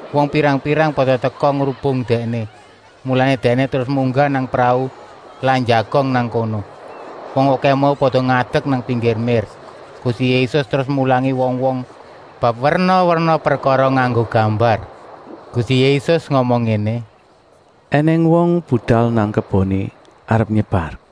Wong pirang-pirang pada teka ngrubung Dèkné, mulané Dèkné terus munggah nang prau lan njagong nang kono. Wong okèh mau pada ngadek nang pinggir mér. Gusti Yésus terus mulangi wong-wong bab werna-werna prekara nganggo gambar. Gusti Yésus ngomong ngéné: “Enèng wong budal nang keboné arep nyebar.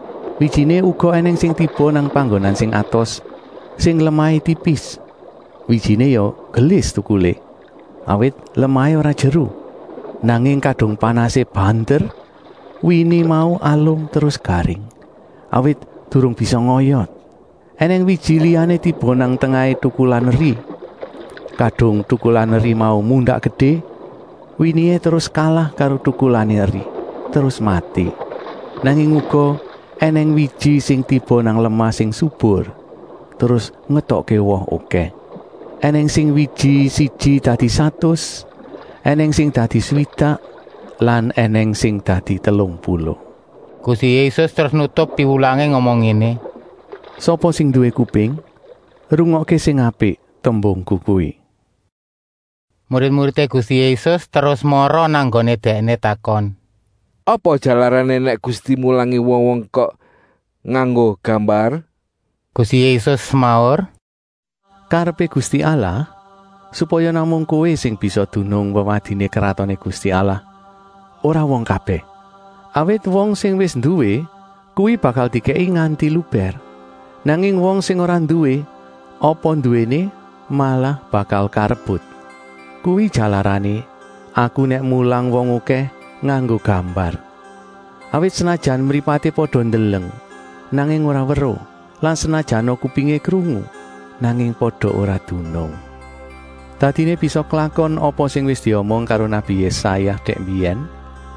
Wijiné uga ènèng sing tiba nang panggonan sing atos, sing lemahé tipis. Wijiné ya gelis tukulé, awit lemahé ora jeru. Nanging kadung panasé banter, wini mau alum terus garing, awit durung bisa ngoyot. Enèng wiji liyané tiba nang tengahé tukulan eri. Kadung tukulan eri mau mundak gedé, winihé terus kalah karo tukulané eri, terus mati. Nanging uga ènèng wiji sing tiba nang lemah sing subur, terus ngetokké woh okèh. Enèng sing wiji siji dadi satus, ènèng sing dadi swidak lan ènèng sing dadi telung puluh.” Gusti Yésus terus nutup piwulangé ngomong ngéné: “Sapa sing nduwé kuping, rungokké sing apik tembungku kuwi.” Murid-muridé Gusti Yésus terus mara nang nggoné Dèkné, takon: “Apa jalarané nèk Gusti mulangi wong-wong kok nganggo gambar?” Gusti Yésus semaur: “Karepé Gusti Allah, supaya namung kowé sing bisa dunung wewadiné Kratoné Gusti Allah, ora wong kabèh. Awit wong sing wis nduwé kuwi bakal dikèki nganti lubèr. Nanging wong sing ora nduwé, apa nduwéné malah bakal karebut. Kuwi jalarané Aku nèk mulang wong okèh nganggo gambar. Awit senajan mripaté pada ndeleng, nanging ora weruh lan senajana kupingé krungu, nanging pada ora dunung. Dadiné bisa klakon apa sing wis diomong karo nabi Yésaya dèk mbiyèn,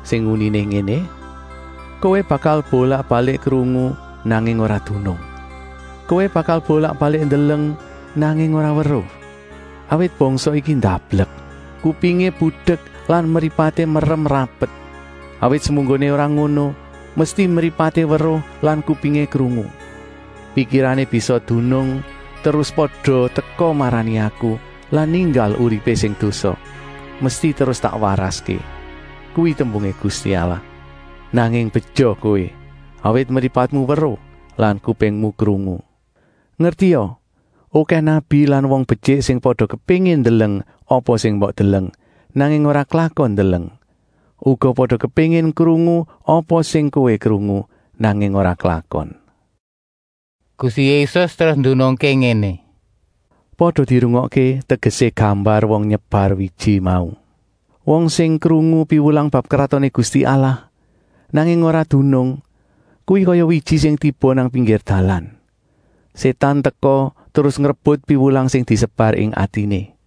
sing uniné ngéné: ‘Kowé bakal bolak-balik krungu, nanging ora dunung. Kowé bakal bolak-balik ndeleng, nanging ora weruh. Awit bangsa iki ndablek, kupingé budek lan mripaté merem rapet. Awit semunggoné ora ngono, mesti mripaté weruh lan kupingé krungu, pikirané bisa dunung terus pada teka marani Aku lan ninggal uripé sing dosa, mesti terus tak waraské. Kuwi tembungé Gusti Allah.’ “Nanging beja kowé, awit mripatmu weruh lan kupingmu krungu. Ngertia, okèh nabi lan wong betyik sing pada kepéngin ndeleng apa sing mbok deleng, nanging ora klakon ndeleng. Uga pada kepéngin krungu apa sing kowé krungu, nanging ora klakon.” Gusti Yésus terus ndunungké ngéné: “Pada dirungokké tegesé gambar wong nyebar wiji mau. Wong sing krungu piwulang bab Kratoné Gusti Allah, nanging ora dunung, kuwi kaya wiji sing tiba nang pinggir dalan. Sétan teka terus ngrebut piwulang sing disebar ing atiné.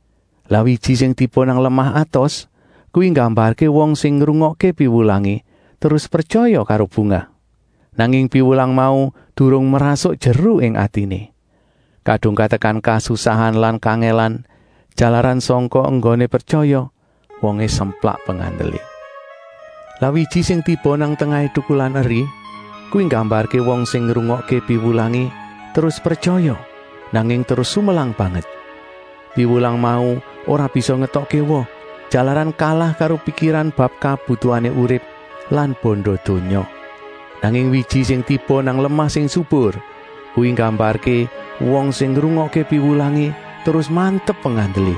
Lah wiji sing tiba nang lemah atos, kuwi nggambarké wong sing ngrungokké piwulangé terus pretyaya karo bungah. Nanging piwulang mau durung mrasuk jeru ing atiné. Kadung katekan kasusahan lan kangèlan jalaran sangka enggoné pretyaya, wongé semplak pengandelé. Lah wiji sing tiba nang tengahé tukulan eri, kuwi nggambarké wong sing ngrungokké piwulangé terus pretyaya, nanging terus sumelang banget. Piwulang mau ora bisa ngetokké woh, jalaran kalah karo pikiran bab kabutuhané urip lan banda donya. Nanging wiji sing tiba nang lemah sing subur, kuwi nggambarké wong sing ngrungokké piwulangé terus mantep pengandelé.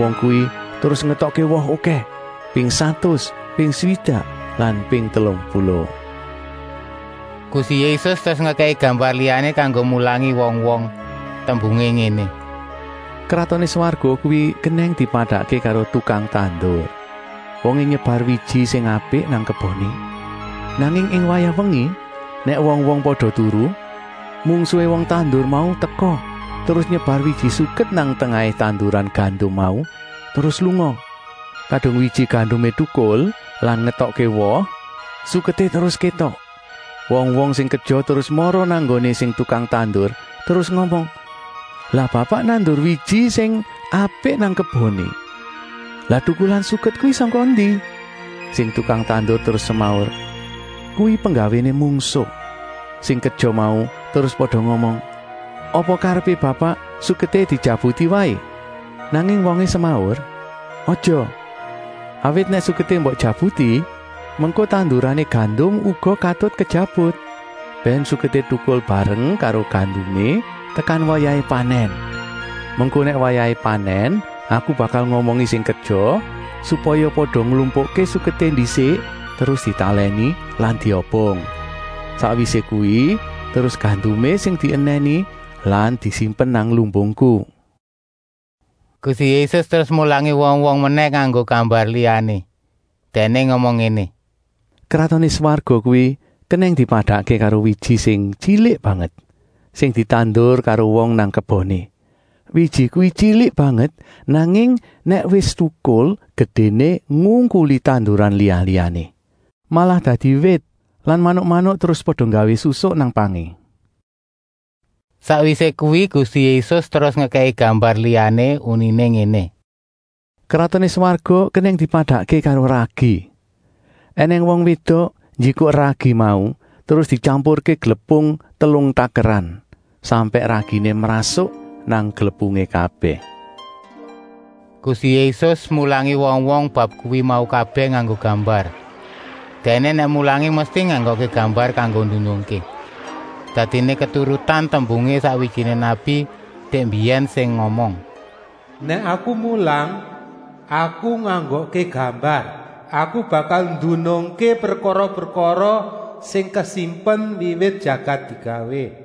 Wong kuwi terus ngetokké woh okèh, ping satus, ping swidak lan ping telung puluh.” Gusti Yésus terus ngekèki gambar liyané kanggo mulangi wong-wong. Tembungé ngéné: “Kratoné Swarga kuwi kenèng dipadakké karo tukang tandur. Wongé nyebar wiji sing apik nang keboné. Nanging ing wayah wengi, nèk wong-wong pada turu, mungsuhé wong tandur mau teka terus nyebar wiji suket nang tengahé tanduran gandum mau, terus lunga. Kadung wiji gandumé tukul lan ngetokké woh, suketé terus kétok. Wong-wong sing kerja terus mara nang nggoné sing tukang tandur terus ngomong: ‘Lah Bapak nandur wiji sing apik nang keboné, lah tukulan suket kuwi sangka endi?’ Sing tukang tandur terus semaur: ‘Kuwi penggawéné mungsuh.’ Sing kerja mau terus pada ngomong: ‘Apa karepé Bapak suketé dijabuti waé?’ Nanging wongé semaur: ‘Aja, awit nèk suketé mbok jabuti, mengko tandurané gandum uga katut kejabut.’ Bèn suketé tukul bareng karo gandumé tekan wayahé panèn. Mengko nèk wayahé panèn aku bakal ngomongi sing kerja, supaya pada nglumpukké suketé ndisik terus ditalèni lan diobong. Sakwisé kuwi terus gandumé sing dienèni lan disimpen nang lumbungku.” Gusti Yésus terus mulangi wong-wong menèh nganggo gambar liyané. Dèkné ngomong ngéné: “Kratoné Swarga kuwi kenèng dipadakké karo wiji sing tyilik banget, sing ditandur karo wong nang keboné. Wiji kuwi tyilik banget, nanging nèk wis tukul gedéné ngungkuli tanduran liya-liyané. Malah dadi wit lan manuk-manuk terus pada nggawé susuk nang pangé.” Sakwisé kuwi Gusti Yésus terus ngekèki gambar liyané, uniné ngéné: “Kratoné Swarga kenèng dipadakké karo ragi. Enèng wong wédok njikuk ragi mau terus dityampurké glepung telung takeran, sampèk raginé mrasuk nang glepungé kabèh.” Gusti Yésus mulangi wong-wong bab kuwi mau kabèh nganggo gambar. Dèkné nèk mulangi mesti nganggokké gambar kanggo ndunungké. Dadiné keturutan tembungé sakwijiné nabi dèk mbiyèn sing ngomong: “Nèk aku mulang, aku nganggokké gambar. Aku bakal ndunungké prekara-prekara sing kasimpen wiwit jagat digawé.”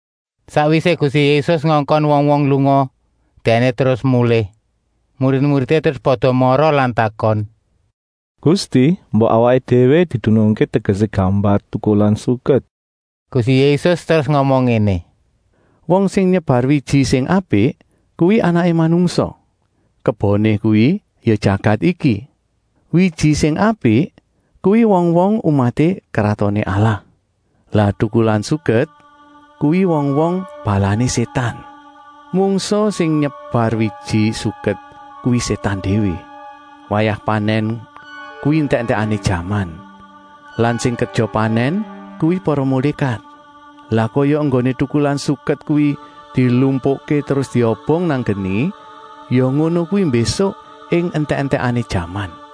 Sakwisé Gusti Yésus ngongkon wong-wong lunga, Dèkné terus mulih. Murid-muridé terus pada mara lan takon: “Gusti, mbok awaké déwé didunungké tegesé gambar tukulan suket.” Gusti Yésus terus ngomong ngéné: “Wong sing nyebar wiji sing apik kuwi Anaké Manungsa. Keboné kuwi ya jagat iki. Wiji sing apik kuwi wong-wong umaté Kratoné Allah. Lah tukulan suket kuwi wong-wong balané Sétan. Mungsuh sing nyebar wiji suket kuwi Sétan déwé. Wayah panèn kuwi entèk-entèkané jaman lan sing kerja panèn kuwi para mulékat. Lah kaya enggoné tukulan suket kuwi dilumpukké terus diobong nang geni, ya ngono kuwi mbésuk ing entèk-entèkané jaman.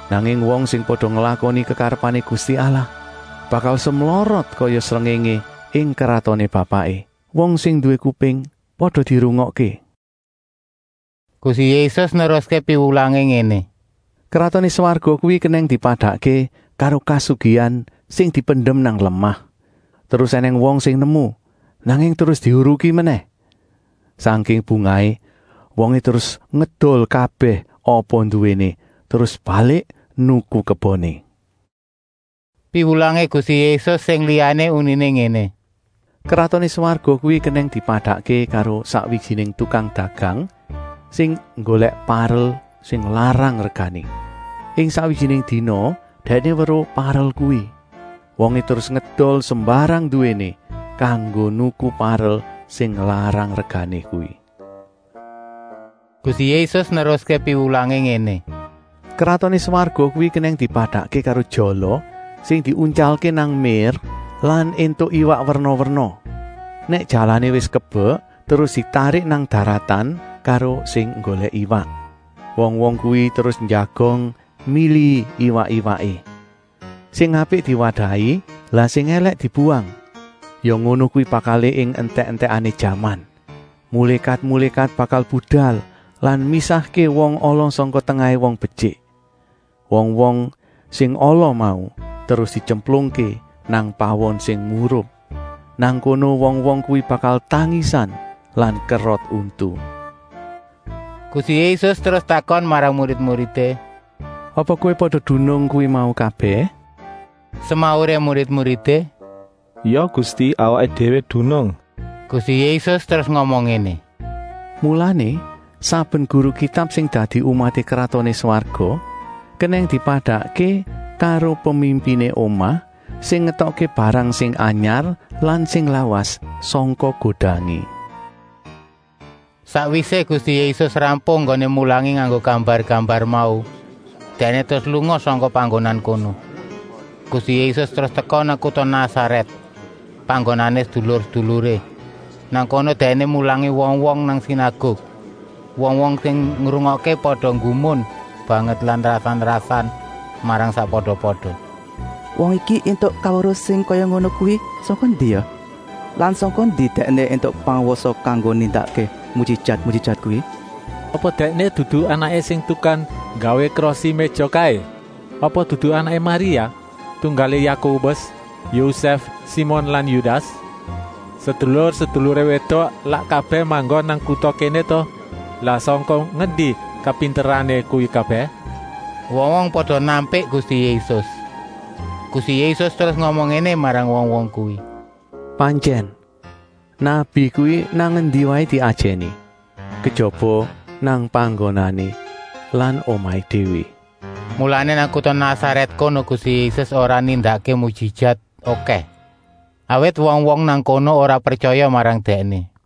Nanging wong sing pada nglakoni kekarepané Gusti Allah bakal semlorot kaya srengéngé ing kratoné Bapaké. Wong sing nduwé kuping, pada dirungokké!” Gusti Yésus neruské piwulangé ngéné: “Kratoné Swarga kuwi kenèng dipadakké karo kasugihan sing dipendem nang lemah. Terus ènèng wong sing nemu, nanging terus dihuruki menèh. Sangking bungahé, wongé terus ngedol kabèh apa nduwéné, terus balik nuku keboné.” Piwulangé Gusti Yésus sing liyané uniné ngéné: “Kratoné Swarga kuwi kenèng dipadakké karo sakwijiné tukang dagang sing nggolèk parel sing larang regané. Ing sakwijiné dina dèkné weruh parel kuwi. Wongé terus ngedol sembarang nduwéné kanggo nuku parel sing larang regané kuwi.” Gusti Yésus neruské piwulangé ngéné: “Kratoné Swarga kuwi kenèng dipadakké karo jala sing diuntyalké nang mér lan éntuk iwak werna-werna. Nèk jalané wis kebek terus ditarik nang daratan karo sing nggolèk iwak. Wong-wong kuwi terus njagong milihi iwak-iwaké. Sing apik diwadahi, lah sing èlèk dibuwang. Ya ngono kuwi bakalé ing entèk-entèkané jaman. Mulékat-mulékat bakal budal lan misahké wong ala sangka tengahé wong betyik. Wong-wong sing ala mau terus dityemplungké nang pawon sing murup. Nang kono wong-wong kuwi bakal tangisan lan kerot untu.” Gusti Yésus terus takon marang murid-muridé: “Apa kowé pada dunung kuwi mau kabèh?” Semauré murid-muridé: “Ya Gusti, awaké déwé dunung.” Gusti Yésus terus ngomong ngéné: “Mulané saben guru Kitab sing dadi umaté Kratoné Swarga kenèng dipadakké karo pemimpiné omah sing ngetokké barang sing anyar lan sing lawas sangka godangé.” Sakwisé Gusti Yésus rampung enggoné mulangi nganggo gambar-gambar mau, Dèkné terus lunga sangka panggonan kono. Gusti Yésus terus teka nang kuta Nasarèt, panggonané sedulur-seduluré. Nang kono Dèkné mulangi wong-wong nang sinaguk. Wong-wong sing ngrungokké pada nggumun banget lan rasan-rasan marang sakpada-pada: “Wong iki éntuk kaweruh sing kaya ngono kuwi sangka ngendi ya? Lan sangka ngendi Dèkné éntuk pangwasa kanggo nindakké mujijat-mujijat kuwi? Apa Dèkné dudu anaké sing tukang nggawé krosi-méja kaé? Apa dudu anaké Maria, tunggalé Yakobus, Yosèf, Simon lan Yudas? Sedulur-seduluré wédok lak kabèh manggon nang kuta kéné ta? Lah sangka ngendi kapinterané kuwi kabèh?” Wong-wong pada nampik Gusti Yésus. Gusti Yésus terus ngomong ngéné marang wong-wong kuwi: “Pantyèn, nabi kuwi nang endi waé diajèni, kejaba nang panggonané lan omahé déwé.” Mulané nang kuta Nasarèt kono Gusti Yésus ora nindakké mujijat okèh, awit wong-wong nang kono ora pretyaya marang Dèkné.